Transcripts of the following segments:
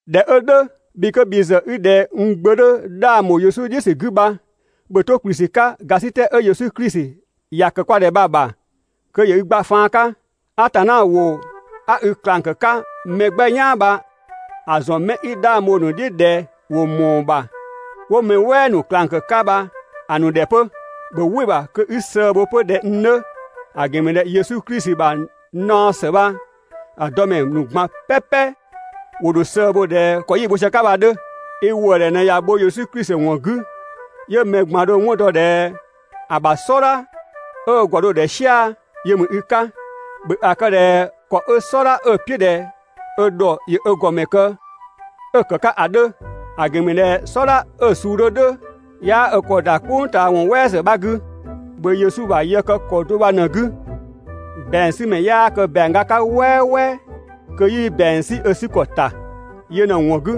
꞊Dhɛ 'ö "dhʋ̈, bhi 'kö bhi ‑zë i ꞊dhɛ n gbö 'dhö 'dhang ‑bho Yesu "dhiʋ̈ ‑sü 'gü bha, ‑bhö 'to ‑kplü ‑sü 'ka ‑gasitɛ 'ö Yesu Klisi ‑ya ‑kë kwa ‑dhɛ bha‑ ‑bha kö ‑yö i gba faan 'ka. Atanna ‑wʋ 'a i ꞊klang ‑kë 'ka mɛ 'gbɛ "yaan bha‑ ‑zɔn 'mɛ 'i 'dhang bho‑ ‑nu "dhiʋ̈ ꞊dhɛ ‑wo ‑mɔɔ ‑bha 'wo mɛ "wɛɛ 'bha ‑nu ꞊klang ‑kë 'ka bha ‑a ‑nu ‑dhɛ 'pö. ‑Bhö "wɩ‑ ‑bha kö 'i sëë bho 'pö ꞊dhɛ n 'dhö, ‑a ‑gɛn ‑mü ꞊dhɛ Yesu Klisi ‑bha naɔ ‑së bha‑ dɔ ‑mɛ ‑nu ꞊gban "pɛpɛ ‑wo ‑dho sëë bho ꞊dhɛ ‑kɔ 'yi‑ bho sië‑ 'ka bha‑ 'dhö. I ‑wëëdhɛ ꞊në ꞊ya bho Yesu Klisi ‑wɔn 'gü, 'yö mɛ ꞊gban dho‑ 'wɔn dɔ ꞊dhɛ ‑a ‑bha "sɔdha 'ö ö ‑gɔ ‑dho ‑dhɛ "sia‑ yö ‑mü i 'ka. ‑Bhö ‑a kë ꞊dhɛ ‑kɔ 'ö "sɔdha 'ö‑ "piʋ̈ ‑dhɛ ö ‑dhɔ ‑yö ö ‑gɔmɛ kë 'ö‑ ‑kë 'ka ‑a 'dhö. ‑A ‑gɛn ‑mü ꞊dhɛ "sɔdha 'ö‑ suu 'dhö "dhʋ̈ 'yaa ö ‑kɔ ‑da "kpʋng ꞊taa ‑wɔn "wɛɛ ‑zë 'bha 'gü. ‑Bhö Yesu ‑bha yë kë ‑kɔ do bha ꞊në‑ 'gü. ‑Bɛangsümɛ 'yaa kë ‑bɛang ga 'ka "wɛɛwɛ kö 'yii ‑bɛang 'sü ö 'sü ‑kɔ ‑ta. (Yö ꞊në‑ ‑wɔn 'gü,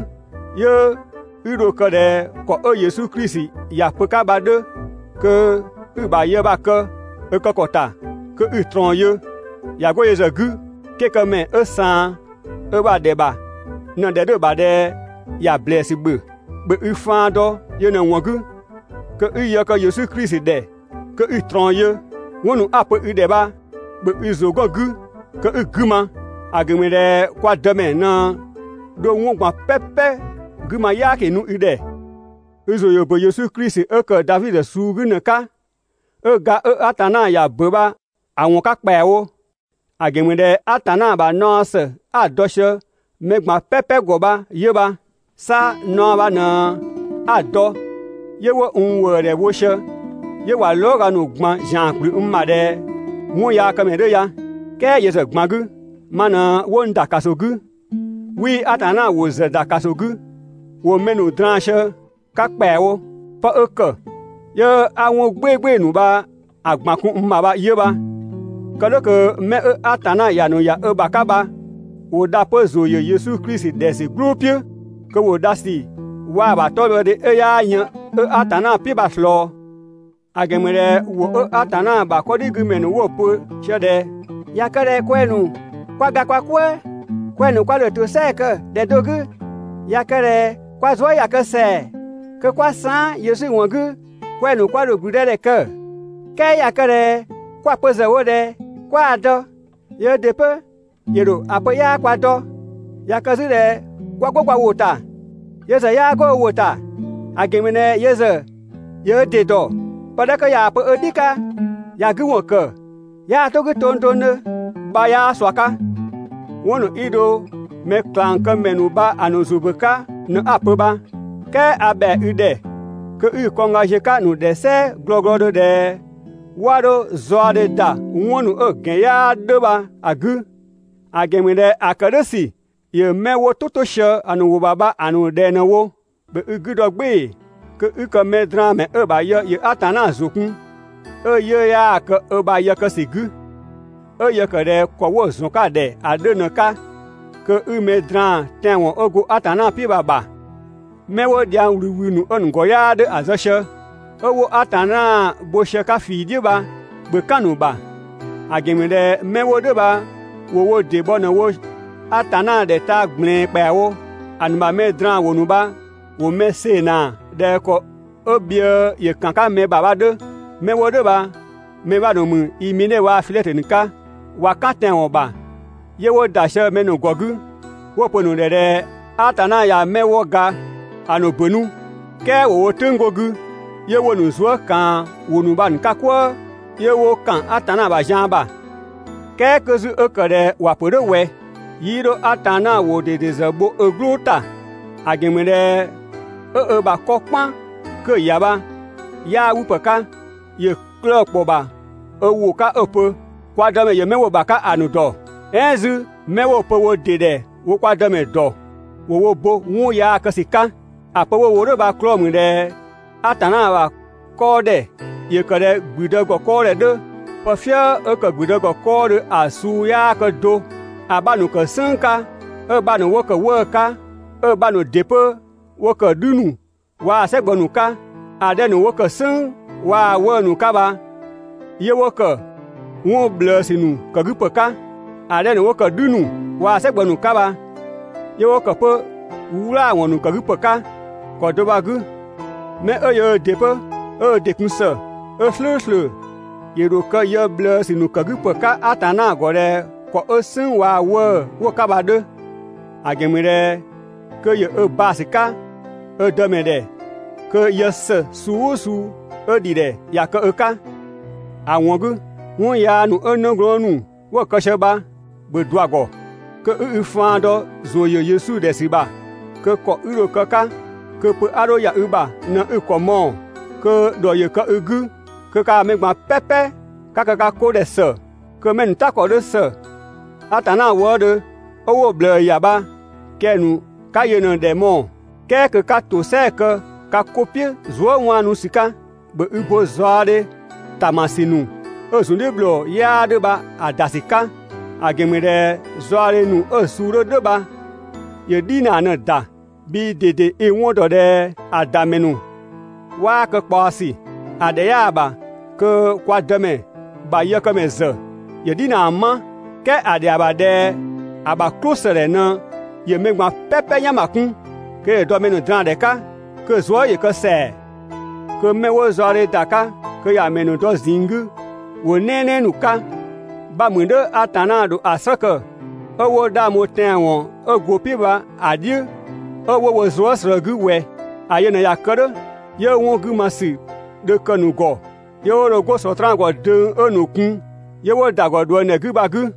'yö 'i dho‑ kë ꞊dhɛ ‑kɔ 'ö Yesu Klisi ‑ya pö‑ 'ka bha‑ 'dhö kö 'i‑ ‑bha yë bha‑ kë ‑a kë ‑kɔ ‑ta kö 'i‑ ꞊trɔɔn yö!) ꞊Ya 'go yö ‑zë 'gü, 'kekëmɛ 'ö ꞊saan ö ‑bha ‑dhɛ ‑bha ꞊në‑ ‑dhɛ 'dhö‑ ‑bha ꞊dhɛ ‑ya ‑blɛɛsü ‑bhö. (‑Bhö i faan dɔ yö ꞊në‑ ‑wɔn 'gü kö i yë kë Yesu Klisi ‑dhɛ kö 'i‑ ꞊trɔɔn yö.) 'Wɔn ‑nu 'a‑ pö i ‑dhɛ bha ‑bhö i ‑zʋ 'gɔn‑ 'gü kö 'i‑ 'gü ma, ‑a ‑gɛn ‑mü ꞊dhɛ kwa Dëmɛ ꞊në dho 'wɔn ꞊gban "pɛpɛ 'gü ma "yaaki nu i ‑dhɛ. I ‑zʋ ‑yö ‑bö Yesu Klisi 'ö ‑kë Davi suu 'gü ‑në 'ka, 'ö ga 'ö Atanna ‑ya ‑bö bha‑ ‑wɔn 'ka ‑kpɛawo. ‑A ‑gɛn ‑mü ꞊dhɛ Atanna ‑bha naɔ ‑së 'a‑ dɔ sië mɛ ꞊gban "pɛpɛ ‑gɔ bha 'yö bha. 'Sa naɔ bha ꞊në 'a‑ dɔ 'yö 'wo n ‑wëëdhɛ bho sië 'yö ꞊wa lɔɔga ‑nu ꞊gban ‑zian ‑kplü n ‑bha ꞊dhɛ 'wɔnyaakëmɛ 'dhö ya. "Kɛɛ yö ‑zë ꞊gban 'gü, ma ꞊në 'wo n ‑da ‑kaso 'gü, 'wii Atanna ‑wʋ ‑zë ‑da ‑kaso 'gü, (‑wo mɛ ‑nu draan‑ sië‑ 'ka ‑kpɛawo). 'Pë 'ö ‑kë 'yö 'a 'wɔn "gbɩɩgbɩɩ‑ ‑nu bha‑ ꞊gban kun n ‑bha bha 'yö bha. Kë "dhʋ̈ kö 'mɛ 'ö Atanna ‑ya ‑nu ‑ya ö ‑bha 'ka bha ‑wo dha 'pö ‑zʋ ‑yö Yesu Klisi ‑dhɛ ‑sü "gblʋʋ "piʋ̈, kö ‑wo dhasü waa‑ ‑bha 'tɔbhɔdhe 'ö 'yaa yën 'ö Atanna "piʋ̈ bha‑ ꞊slɔɔ. ‑A ‑gɛn ‑mü ꞊dhɛ ‑wʋ ('ö Atanna ‑bha 'kɔdhigümɛ ‑nu 'wo‑ pö) ꞊sië ꞊dhɛ: «꞊Ya kë ꞊dhɛ kwɛng‑ ‑nu 'kwa ga kwa "kwëë, kwɛng‑ ‑nu kwa ‑dho ‑tosɛa kë ‑dhɛ do 'gü. ꞊Ya kë ꞊dhɛ kwa zuë" ꞊ya kë ‑sɛa kö ('kwa saan" Yesu ‑wɔn 'gü) kwɛng‑ ‑nu kwa ‑dho ‑gblüdëdhɛ kë. "Kɛɛ ꞊ya kë ꞊dhɛ 'kwa‑ pö ‑zë wo ꞊dhɛ 'kwaa‑ dɔ, yöö ‑dɩ 'pö ‑yö ‑dho ‑a pö 'yaa kwa dɔ. ꞊Ya kë 'zü ꞊dhɛ 'kwa 'go kwa ‑wʋ ‑ta, yö ‑zë 'yaa 'go ö ‑wʋ ‑ta, ‑a ‑gɛn ‑mü ꞊dhɛ yö ‑zë ‑yö ö ‑dɩ ‑dɔ. Pë 'dhɛ 'kö ꞊yaa‑ pö ö "dhi 'ka ‑ya 'gü ‑wɔn ‑kë, 'yaa 'to‑ 'gü tongtongdhö» bha 'yaa ꞊sua 'ka. 'Wɔn ‑nu 'i dho mɛklangkëmɛ ‑nu bha‑ ‑nu ‑zʋ ‑bö 'ka ꞊në 'a‑ pö bha, "kɛɛ a ‑bhɛa i ‑dhɛ kö 'i i kɔngga ziö‑ 'ka‑ ‑nu ‑dhɛ "sɛɛ glɔglɔdhö ꞊dhɛ 'wa 'dho zaɔdhe ‑da 'wɔn ‑nu 'ö‑ ‑gɛn 'yaa 'dhö bha‑ 'gü, ‑a ‑gɛn ‑mü ꞊dhɛ ‑a ‑kë "dhʋ̈ ‑sü ‑yö 'mɛ 'wo "tʋ 'to sië‑ ‑nu ‑wʋ ‑bha bha‑ ‑nu ꞊dhɛng ꞊në‑ wo. ‑Bhö i 'gü dɔ "gbɩɩ‑ kö 'i kë mɛdraanmɛ 'ö‑ ‑bha yë ‑yö Atanna ‑zʋ kun, 'ö 'yiʋ̈‑ 'yaa‑ kë ö ‑bha yë kë ‑sü 'gü, 'ö yë ‑kë ꞊dhɛ ‑kɔ 'wo‑ ‑zɔn 'ka‑ ‑dhɛ ‑a 'dhö ꞊në‑ 'ka, kö i mɛ draan‑ tɛanwɔn 'ö go Atanna "piʋ̈ bha‑ ‑bha. 'Mɛ 'wo dhiang ꞊wlüwlü ‑nu 'ö‑ ‑gɔ 'yaa 'dhö‑ zë sië, 'ö 'wo Atanna bho sië‑ 'ka ꞊fii "dhiʋ̈ bha, ‑bhö "kan‑ ‑nu ‑bha, ‑a ‑gɛn ‑mü ꞊dhɛ 'mɛ 'wo "dhʋ̈ bha ‑wo wo ‑dɩ bhɔ ꞊në‑ wo Atanna ‑dhɛ taa‑ ꞊gblɛɛn ‑kpɛawo. ‑A ‑nu ‑bha mɛ draan‑ ‑wʋ ‑nu bha ‑wo mɛ see‑ ꞊naa ꞊dhɛ ‑kɔ 'ö bhië ‑yö ‑kan 'ka mɛ ‑bha bha‑ 'dhö. 'Mɛ 'wo "dhʋ̈ bha‑ ‑mɛ 'bha ‑nu ‑mü Imene waa‑ Filɛtö ‑nu 'ka. ꞊Wa "kan tɛanwɔn ‑bha, 'yö 'wo ‑da sië mɛ ‑nu ‑gɔ 'gü 'wo‑ pö‑ ‑nu ‑dhɛ ꞊dhɛ Atanna ꞊ya 'mɛ 'wo ga ‑a ‑nu ‑bö 'nu, "kɛɛ ‑wo wo "tʋ̈ng 'go‑ 'gü, ('yö 'wo‑ ‑nu zuë" ꞊kaan ‑wʋ ‑nu bha‑ 'ka "kwëë, 'yö 'wo ‑kan Atanna ‑bha zian ‑bha). "Kɛɛ 'kö 'zü 'ö ‑kë ꞊dhɛ ‑wa ‑pö "dhʋ̈ ꞊wɛ, 'yii 'dho Atanna ‑wʋ ꞊dede ‑zë bho ö "gblʋʋ ‑ta. ‑A ‑gɛn ‑mü ꞊dhɛ 'ö ö ‑bha 'kɔ "kpan 'kö‑ ‑ya bha 'yaa 'wü ‑pë 'ka, ‑yö 'klëë‑ ‑kpɔ ‑bha ö ‑wʋ 'ka 'ö‑ pö: «Kwa Dëmɛ ‑yö 'mɛ 'wo‑ ‑bha 'ka ‑a ‑nu ‑dɔ» "ɛɛn 'zü: «'Mɛ 'wo‑ pö wo ‑dɩ ‑dhɛ wo kwa Dëmɛ ‑dɔ, ‑wo wo ‑bo 'wɔn yaa kë ‑sü 'ka.» ‑A pö 'a‑ wo "dhʋ̈ bha‑ 'klɔɔ‑ ‑mü ꞊dhɛ Atanna ‑bha 'kɔɔdhɛ ‑yö ‑kë ꞊dhɛ ‑gblüdë ‑gɔ 'kɔɔdhɛ 'dhö. Pë "fië 'ö ‑kë ‑gblüdë ‑gɔ 'kɔɔdhö ‑a suu 'yaa kë do. ‑A 'bha ‑nu ‑kë "sënng 'ka 'ö‑ 'bha ‑nu 'wo ‑kë 'wëë‑ 'ka, 'ö‑ 'bha ‑nu ‑dɩ 'pö 'wo ‑kë "dhü ‑nu waa‑ "sɛ gbɔ ‑nu 'ka. ‑A 'dhɛ ‑nu 'wo ‑kë "sënng waa‑ 'wëë‑ ‑nu 'ka bha 'yö 'wo ‑kë 'wɔn ꞊bhlëësü ‑nu ‑kë 'gü ‑pë 'ka. ‑A 'dhɛ ‑nu 'wo ‑kë "dhü ‑nu waa‑ "sɛgbɔ ‑nu 'ka bha, 'yö 'wo ‑kë 'pö "wlaawɔn ‑nu ‑kë 'gü ‑pë 'ka. ‑Kɔ do bha‑ 'gü, 'mɛ 'ö yöö ‑dɩ 'pö 'ö ö ‑dɩ kun ‑së, 'ö "slʋ̈ʋ̈slʋ̈, ‑yö ‑dho kë yë ꞊bhlëësü ‑nu ‑kë 'ka ‑pë 'ka Atanna ‑gɔ ꞊dhɛ ‑kɔ 'ö "sënng waa‑ 'wëë‑ 'wo‑ 'ka bha‑ 'dhö; ‑a ‑gɛn ‑mü ꞊dhɛ kö ‑yö ö baa‑ ‑sü 'ka ö Dëmɛ ‑dhɛ kö yë ‑së suu "ʋʋ suu 'ö ‑dhi ‑dhɛ ‑ya kë ö 'ka. ‑A ‑wɔn 'gü, 'wɔn yaa ‑nu 'ö 'nëglɔɔn ‑nu 'wo‑ kë sië bha, ‑bhö ꞊dua‑ ‑gɔ. Kö 'i i faan dɔ ‑zʋ ‑yö Yesu ‑dhɛ ‑sü ‑bha, kö ‑kɔ 'i dho‑ kë‑ 'ka kö pö 'a 'dho ‑ya i ‑bha ꞊në 'i‑ ‑kɔ mɔɔ‑, kö ‑dhɔ ‑yö kë i 'gü, kö kaa mɛ ꞊gban "pɛpɛ ka kë ka 'ko ‑dhɛ ‑së, kö mɛ 'ö‑ ‑nu "ta ‑kɔ 'dhö ‑së Atanna wëëdhö 'ö 'wo‑ ꞊bhlëë ‑ya bha kɛng‑ ‑nu 'ka yö ꞊në‑ ‑dhɛ mɔɔ‑; "kɛɛ kö 'ka ‑tosɛa kë ka 'ko "piʋ̈ zuë" 'waanu ‑sü 'ka. ‑Bhö i bo zaɔdhe ꞊taamasü ‑nu 'ö‑ ‑zun "dhiʋ̈ ‑bhlɔɔ 'yaa 'dhö bha‑ ‑da ‑sü 'ka; ‑a ‑gɛn ‑mü ꞊dhɛ zaɔdhe ‑nu 'ö‑ suu 'dhö "dhʋ̈ bha ‑yö "dhinaa ꞊në‑ ‑da. Bhii ꞊dede i‑ 'wɔn dɔ ꞊dhɛ ‑a ‑da ‑mɛ ‑nu 'waa kë ꞊kpaɔsü. ‑A ‑dhɛ 'yaa‑ ‑bha kö kwa Dëmɛ ‑bha yëkëmɛ ‑zë ‑yö "dhinaa 'ma, "kɛɛ ‑a ‑dhɛa ‑bha ꞊dhɛ ‑a ‑bha "klʋsëdhɛ ꞊në ‑yö mɛ ꞊gban "pɛpɛ "yan ‑ma kun, kö ‑yö dɔ mɛ ‑nu draandhɛ 'ka, kö‑ zuë" ‑yö kë ‑sɛa. Kö 'mɛ 'wo zaɔdhe ‑da 'ka kö ‑ya ‑mɛ ‑nu dɔ ꞊zinng 'gü ‑wʋ "nɛɛnɛɛ ‑nu 'ka, 'bha mü "dhʋ̈ Atanna ‑dho ‑a "slë kë 'ö 'wo 'dhang bho tɛanwɔn 'ö go‑ "piʋ̈ bha‑ "dhiʋ̈ 'ö 'wo wo zuë" ꞊slëë 'gü ꞊wɛ? ‑A yö ꞊në ꞊ya kë "dhʋ̈ 'yö 'wɔn 'gü ma ‑sü dho kë‑ ‑nu ‑gɔ 'yö 'wo dho 'go Sɔtraan ‑gɔ döng 'ö‑ ‑nu kun 'yö 'wo ‑da ‑gɔ ꞊dhuëngdhɛ 'gü bha‑ 'gü.